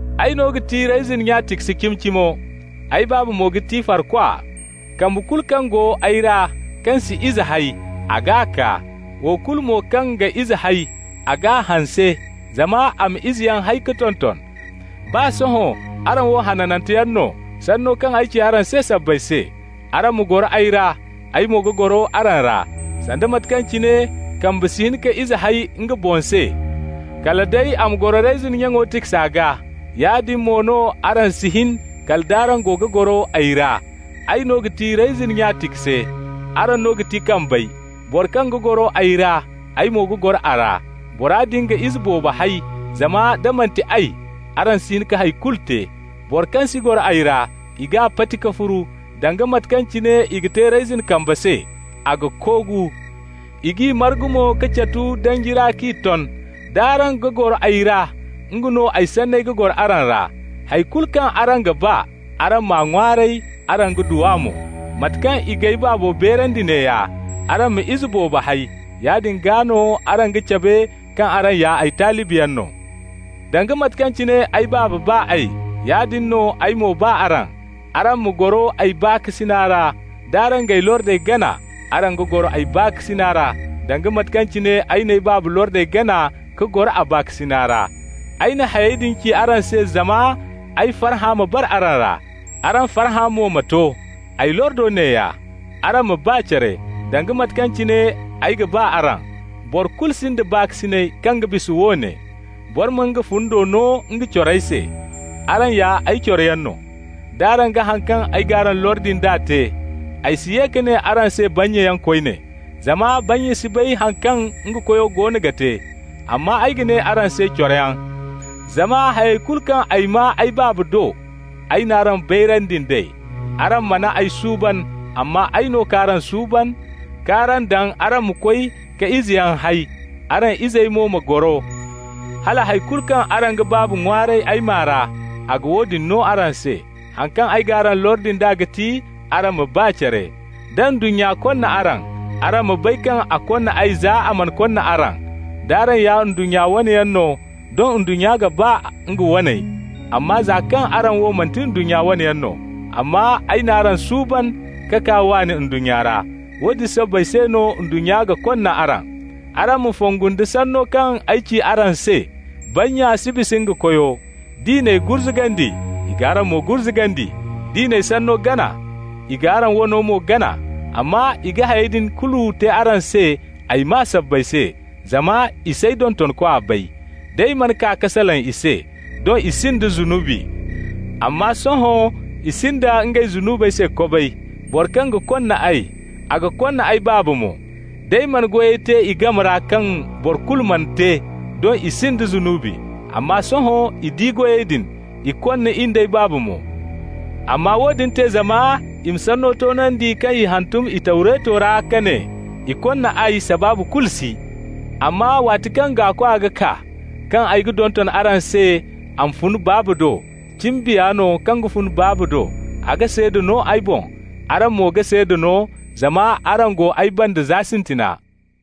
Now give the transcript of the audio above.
Ay no ga ti reyzin nya tikse cimi-cimo, ay Baaba mo ga ti farkwa. Kambe kulu kaŋ go ay ra kaŋ si ize hay, a g'a kaa. Wo kulu mo kaŋ ga izeyaŋ hay, a g'a hanse, zama a ma izeyaŋ hay ka tonton. Baa sohõ araŋ wo hananteyaŋ no, sanno kaŋ ay ci araŋ se sabbay se. Araŋ ma goro ay ra, ay mo ga goro araŋ ra. Sanda mate kaŋ cine kambe si hin ka ize hay nga boŋ se, kala day a ma goro reyzin nyaŋo tiksa gaa, yaadin mo no araŋ si hin, kala nd'araŋ go ga goro ay ra. Ay no ga ti reyzin nya tikse, araŋ no ga ti kambey. Boro kaŋ ga goro ay ra, ay mo ga goro a ra, bora din ga ize boobo hay, zama da manti ay, araŋ si hin ka hay kulu te. Boro kaŋ si goro ay ra, i g'a pati ka furu, danga mate kaŋ cine i ga te reyzin kambe se. A ga koogu. I g'i margu mo ka catu danji ra k'i ton. D'araŋ ga goro ay ra, nga no ay sanney go araŋ ra, hay kulu kaŋ araŋ ga ba, araŋ m'a ŋwaaray, araŋ ga du a mo. Mate kaŋ i g'ay Baabo beerandi neeya: araŋ ma ize boobo hay. Yaadin gaa no araŋ ga cabe kaŋ araŋ ya ay talibiyaŋ no. Danga mate kaŋ cine ay Baaba ba ay, yaadin no ay mo ba araŋ. Araŋ ma goro ay baakasina ra. D'araŋ g'ay lordey gana, araŋ ga goro ay baakasina ra, danga mate kaŋ cine ay n'ay Baaba lordey gana ka goro a baakasina ra. Ay na hayey din ci araŋ se zama ay farhã ma bara araŋ ra, araŋ farhã mo ma to. Ay lordo neeya: araŋ ma ba care, danga mate kaŋ cine ay ga ba araŋ. Boro kulu sinda baakasinay kaŋ ga bisa woone: boro ma nga fundi no nga corey se. Araŋ ya ay coroyaŋ no, d'araŋ ga haŋ kaŋ ay g'araŋ lordi nd'a te. Ay si ye ka ne araŋ se bannyayaŋ koyne, zama bannya si bay haŋ kaŋ nga koyo goono ga te. Amma ay ga ne araŋ se coroyaŋ, zama hayey kulu kaŋ ay maa ay Baaba do, ay n'araŋ bayrandi nd'ey. Araŋ mana ay suuban, amma ay no k'araŋ suuban k'araŋ daŋ araŋ ma koy ka izeyaŋ hay, araŋ izey mo ma goro, hala hay kulu kaŋ araŋ ga Baaba ŋwaaray ay maa ra, a ga woodin no araŋ se. Haŋ kaŋ ay g'araŋ lordi nd'a ga ti: araŋ ma ba care. Da ndunnya konna araŋ, araŋ ma bay kaŋ a konna ay za a mana konna araŋ. D'araŋ ya ndunnya wane yaŋ no, doŋ ndunnya ga ba nga waney, amma za kaŋ araŋ wo manti ndunnya wane yaŋ no, amma ay n'araŋ suuban ka kaa waani ndunnya ra, woodin sabbay se no ndunnya ga konna araŋ. Araŋ ma fongu nda sanno kaŋ ay ci araŋ se: ‹bannya si bisa nga koyo›. D'i n'ay gurzugandi, i g'araŋ mo gurzugandi. D'i n'ay sanno gana, i g'araŋ wano mo gana. Amma i ga hayey din kulu te araŋ se ay maa sabbay se, zama i s'ay dontonkwa bay. D'ay mana kaa ka salaŋ i se, doŋ i sinda zunubi, amma sohõ i sinda ngey zunubey se kobay. Boro kaŋ ga konna ay, a ga konna ay Baaba mo. D'ay mana goyey te i game ra kaŋ boro kulu mana te, doŋ i sinda zunubi, amma sohõ i di goyey din, i konna in d'ay Baaba mo. Amma woodin te zama i ma sanno toonandi kaŋ i hantum i Tawreto ra ka ne: ‹I konna ay, sabaabu kulu si.› Amma waati kaŋ Gaakwa ga kaa, kaŋ ay ga donton araŋ se a ma fun Baaba do, cimi Biya no kaŋ ga fun Baabo do, a ga seeda no ay boŋ. Araŋ mo ga seeda no, zama araŋ go ay banda za sintina.